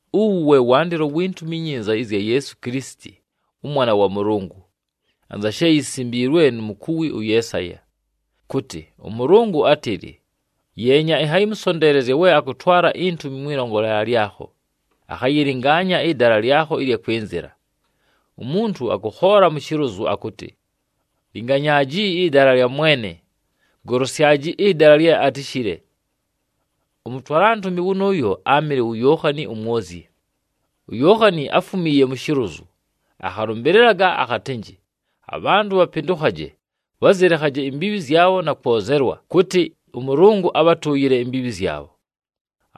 Uwu we wandɨlo wi Ntumi iNyinza ɨzya Yeesu Kilisiti ʉMwana wa Mʉlʉngʉ, anza she yisimbiilwe nu mukuwi ʉYeesaya, kʉtɨ ʉMʉlʉngʉ átɨlɨ, “Yeenya, ɨnhayɨmʉsonteelezya we akʉtwala intumi mwɨlongolela lyakho, akhayɨlɨngaanya ɨdala lyakho ɨlya kwɨnzɨla. Umuntu akʉkhoola mu shilozu akʉtɨ, ‘Linganyaaji ɨdala lya Mwene, golosyaji ɨdala lye atɨshɨle.’” Ʉmʉtwala ntumi wʉnʉʉyo áamɨle wu Yookhani uMwozyi. UYookhani áfumiiye mu shilozu, akhalʉmbɨlɨlaga akhatɨnjɨ abhantʉ bhapɨndʉkhaje, bhazɨlekhaje imbiibhi zyabho na kwozelwa kʉtɨ, ʉMʉlʉngʉ abhatʉʉyɨle imbiibhi zyabho.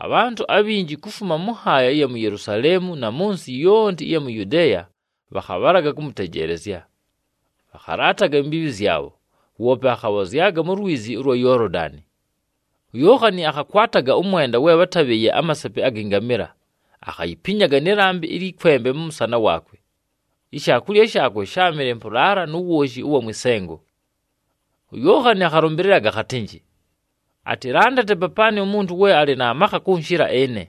Abhantʉ abhinji kufuma mʉ nhaaya ɨya mu Yelusaleemu na mʉ nsɨ yonti ɨya mu Yudeeya bhakhabhalaga kʉmʉtejeelezya. Bhakhalaataga imbiibhi zyabho, woope akhabhozyaga mu lwizi ʉlwa Yoolodani. UYookhani akhakwataga ʉmwenda we bhátabhɨɨye amasepe agɨ ngamɨla, akhayipinyaga nɨ lambɨ ɨlyɨ gwembe mʉ mʉsana waakwe. Ishaakulya shaakwe sháamɨle mpʉlaala nu wooshi ʉwa mwɨ sengo. UYookhani akhalʉmbɨlɨlaga akhatɨnjɨ, “Atɨlandate papaanɨ umuntu we alɨ na makha kʉnshɨla ɨne,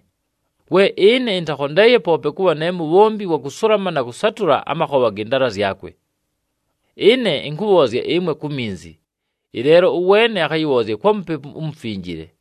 we ɨne ɨntakhondeeye poope kʉbha ne mubhombi wa kusulama na kʉsatʉla amakhobha gɨ ndaala zyakwe. Ɨne ɨnkʉbhoozya ɨmwe ku minzi, ɨleelo ʉweene akhayɨbhoozya kwa Mupepu uMufinjile.”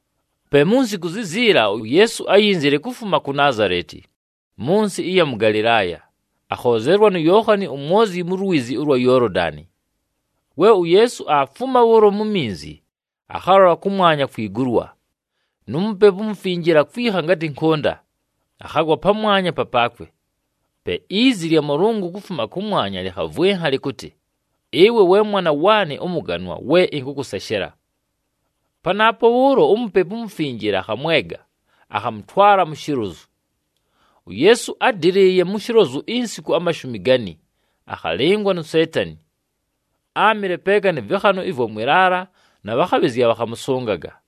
Pe mu nsiku ziziila, uYeesu áyinzile kufuma ku Naazaleti, mʉ nsɨ ɨya mʉ Galɨlaaya, akhoozelwa nu Yookhani uMwozyi mu lwizi ʉlwa Yoolodani. We uYeesu aafuma bhʉʉlo mu minzi, akhalola kʉmwanya kwigulwa, nu Mupepu uMufinjile akwikha ngatɨ nkʉnda, akhagwa pamwanya papaakwe. Pe izi lya Mʉlʉngʉ kufuma kʉmwanya lɨkhavwɨnha lɨkʉtɨ, “Ɨwe we Mwana waanɨ ʉmʉganwa, we ɨnkʉkʉseshela.” Panaapo bhʉʉlo uMupepu uMufinjile akhamwega, akhamʉtwala mu shilozu. UYeesu ádɨlɨɨye mu shilozu insiku amashumi gani, akhalɨngwa nu Seetani. Áamɨle peeka nɨ vɨkhanʉ ɨvwa mwɨ laala na bhakhabhɨzya bhakhamʉsʉngaga.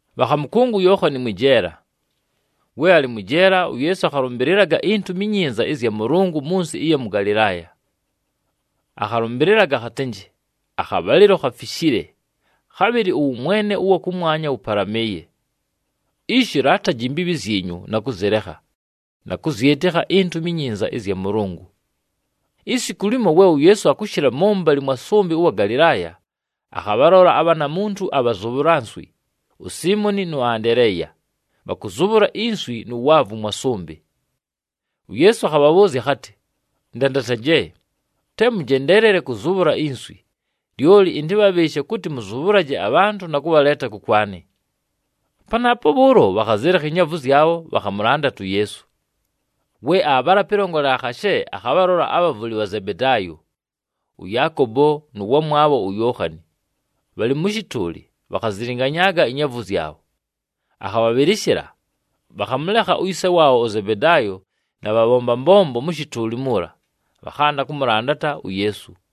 Bhakhamʉkʉnga uYookhani mwɨ jeela. We alɨ mwɨ jeela, uYeesu akhalʉmbɨlɨlaga iNtumi iNyinza ɨzya Mʉlʉngʉ mʉ nsɨ ɨya mʉ Galɨlaaya. Akhalʉmbɨlɨlaga akhatɨnjɨ, “Akhabhalɨlo khafishile, khabhɨlɨ ʉwʉmwene ʉwa kʉmwanya wʉpalamɨɨye. Ishi laataji imbiibhi zyinyu na kʉzɨlekha, na kʉzyɨtɨkha iNtumi iNyinza ɨzya Mʉlʉngʉ.” Isiku limo we uYeesu akʉshɨla mʉmbalɨ mwa sʉmbɨ ʉwa Galɨlaaya, akhabhalola abhaana muntu abhazʉbhʉla nswi, uSiimoni nʉ Andeleeya, bhakʉzʉbhʉla inswi nu waavu mwa sʉmbɨ. UYeesu akhabhabhʉʉzya akhatɨ, “Ndandataje, te mʉjendeelele kʉzʉbhʉla inswi, lyoli ɨntɨbhabhɨɨshe kʉtɨ mʉzʉbhʉlaje abhantʉ na kʉbhaleeta kʉkwanɨ.” Panaapo bhʉʉlo, bhakhazɨlekha inyaavu zyabho, bhakhamʉlandata uYeesu. We aabhala pɨlongolela khashe, akhabhalola abhavʉlɨ bha Zebedaayo, ʉYaakobo nʉ wamwabho uYookhani, bhalɨ mʉ shɨtʉʉlɨ, bhakhazɨlɨnganyaaga inyaavu zyabho. Akhabhabhɨlɨshɨla, bhakhamʉlekha uyise waabho ʉZebedaayo na bhabhomba mbombo mʉ shɨtʉʉlɨ muula, bhakhanda kʉmʉlandata uYeesu.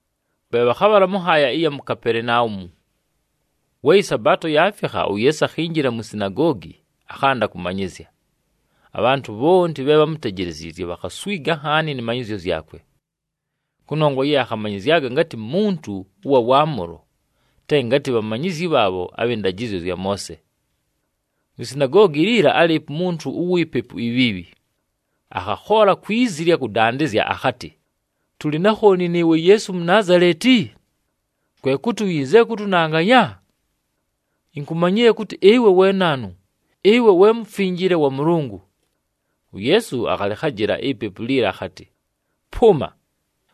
Pe bhakhabhala mʉ nhaaya ɨya mu Kapelenaumu. We ɨSabaato yaafikha, uYeesu akhinjila mwi sinagoogi, akhanda kʉmanyɨzya. Abhantʉ bhonti bhe bhámutejeleziizye, bhakhaswiga nhaani nɨ manyɨzyo zyakwe, kʉnongwa ye akhamanyɨzyaga ngatɨ muntu ʉwa waamʉlo, te ngatɨ bhamanyizyi bhaabho abhɨ ndajɨzyo zya Moose. Mwi sinagoogi liila, álɨɨpo umuntu uwi pepu ibhiibhi. Akhakhoola kwi zi ɨlya kʉdandɨzya, akhatɨ, “Tʉlɨ na khooni nɨɨwe Yeesu Munaazaleti? Kwe kʉtɨ uyinzile kʉtʉnanganya? Inkumanyile kʉtɨ ɨwe we naanu, ɨwe we Mufinjile wa Mʉlʉngʉ!” UYeesu akhalɨkhajɨla ipepu liila akhatɨ, “Pʉʉma!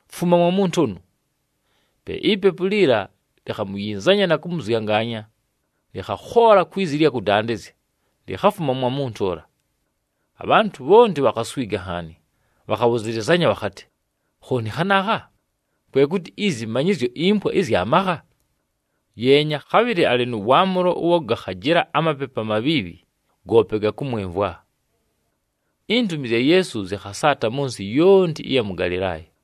Fuma mwa muntu ʉnʉ!” Pe ipepu liila likhamuyinzanya na kʉmʉzyangaanya, lɨkhakhoola kwi zi ɨlya kʉdandɨzya, likhafuma mwa muntu ʉla. Abhantʉ bhonti bhakhaswiga nhaani, bhakhabhʉzɨlɨzanya bhakhatɨ, “Khooni khanaakha, kwe kʉtɨ izi manyɨzyo impwa ɨzya makha! Yeenya, khabhɨlɨ alɨ nʉ waamʉlo ʉwa kʉgakhajɨla amapepu amabhiibhi, goope gakʉmwɨmvwa.” Intumi zya Yeesu zɨkhasaata mʉ nsɨ yonti ɨya mʉ Galɨlaaya.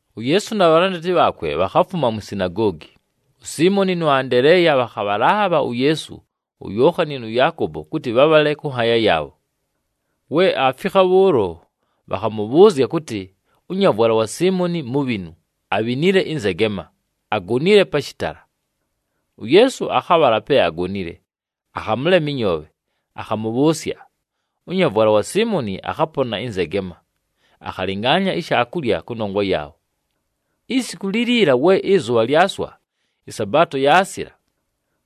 UYeesu na bhalandati bhaakwe bhakhafuma mwi sinagoogi. USiimoni nʉ Andeleeya bhakhabhalaabha uYeesu, uYookhani nʉ Yaakobo kʉtɨ bhabhale kʉ nhaaya yaabho. We aafikha bhʉʉlo, bhakhamʉbhʉʉzya kʉtɨ, ʉnyavwala wa Siimoni mubhinu, abhinile ɨnzegema, agonile pa shɨtala. UYeesu akhabhala pe agonile, akhamʉlema ɨnyoobhe, akhamʉbhʉʉsya. Ʉnyavwala wa Siimoni akhapona ɨnzegema, akhalɨngaanya ishaakulya kʉnongwa yaabho. Isiku liliila we ɨzʉbha lyaswa, ɨSabaato yaasila,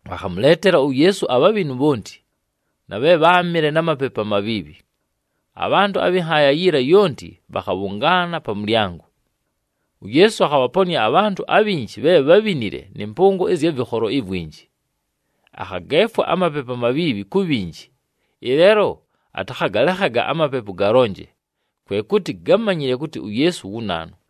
bhakhamʉleetela uYeesu abhabhinu bhonti, na bhe bháamɨle na mapepu amabhiibhi. Abhantʉ abhɨ nhaaya yiila yonti, bhakhabhʉngaana pa mʉlyango. UYeesu akhabhaponɨa abhantʉ abhinji bhe bhábhinile nɨ mpʉngo ɨzya vɨkholo ivwinji. Akhageefwa amapepu amabhiibhi ku bhinji, ɨleelo atakhagalekhaga amapepu galonje, kwe kʉtɨ gámanyile kʉtɨ uYeesu wu naanu.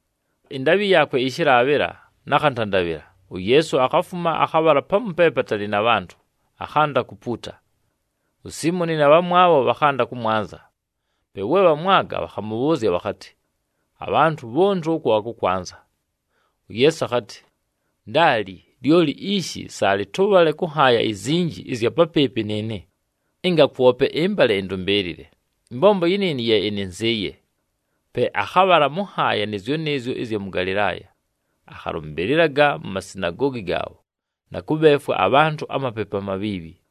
Ɨndaabhɨ yaakwe ɨshɨlaabhɨla, nakhantandabhɨla, uYeesu akhafuma akhabhala pamu pe patalɨ na bhantʉ, akhanda kupuuta. USiimoni na bhamwabho bhakhanda kʉmwanza. Pe we bhamwaga, bhakhamʉbhʉʉzya bhakhatɨ, “Abhantʉ bhonti ʉkwo bhakʉkwanza!” UYeesu akhatɨ, “Ndaali, lyoli ishi saalɨ tʉbhale kʉ nhaaya izinji ɨzya papɨɨpɨ nɨɨnɨ, ɨnga kwope ɨmbale ɨndʉmbɨɨlɨle, ɨmbombo yɨnɨɨnɨ ye ɨnɨnzɨɨye.” Pe akhabhala mʉ nhaaya nɨɨzyo nɨɨzyo ɨzya mʉ Galɨlaaya, akhalʉmbɨlɨlaga mu masinagoogi gaabho, na kʉbheefwa abhantʉ amapepu amabhiibhi.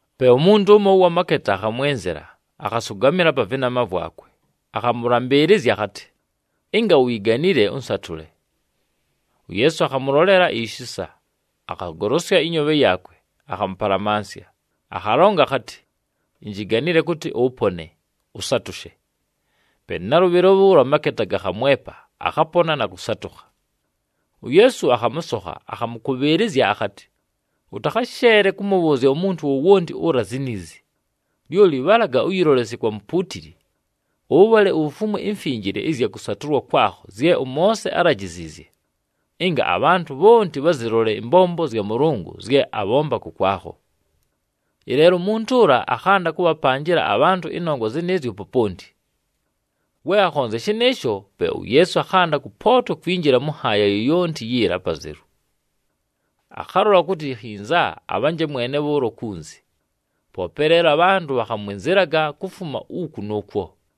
Pe umuntu ʉmo ʉwa maketa akhamwɨnzɨla, akhasʉgamɨla pa vɨnama vwakwe, akhamʉlambɨɨlɨzya akhatɨ, “Ɨnga uyiganile, ʉnsatʉle.” UYeesu akhamʉlolela ishisa, akhagolosya ɨnyoobhe yaakwe, akhamʉpalamansya, akhalonga akhatɨ, “Injiganile kʉtɨ ʉpone, ʉsatʉshe!” Pe nalʉbhɨlo bhʉʉlo amaketa gakhamwepa, akhapona na kʉsatʉkha. UYeesu akhamʉsokha, akhamʉkʉbhɨɨlɨzya akhatɨ, “Ʉtakhasheele kʉmʉbhʉʉzya umuntu wowonti ʉla ziniizi. Lyoli bhalaga ʉyɨlolesye kwa mupuutili, ʉbhale ufumwe imfinjile ɨzya kʉsatʉlwa kwakho zye ʉMoose álajiziizye, ɨnga abhantʉ bhonti bhazɨlole ɨmbombo zya Mʉlʉngʉ zye abhomba kʉkwakho.” Ɨleelo umuntu ʉla akhanda kʉbhapanjɨla abhantʉ ɨnongwa zɨnɨɨzyo poponti. We akhonzya shɨnɨɨsho, pe uYeesu akhanda kʉpootwa kwinjila mʉ nhaaya yoyonti yiila apazelu. Akhalola kʉtɨ khinza abhanje mwene bhʉʉlo kunzi, poope leelo abhantʉ bhakhamwɨnzɨlaga kufuma uku nʉʉkwo.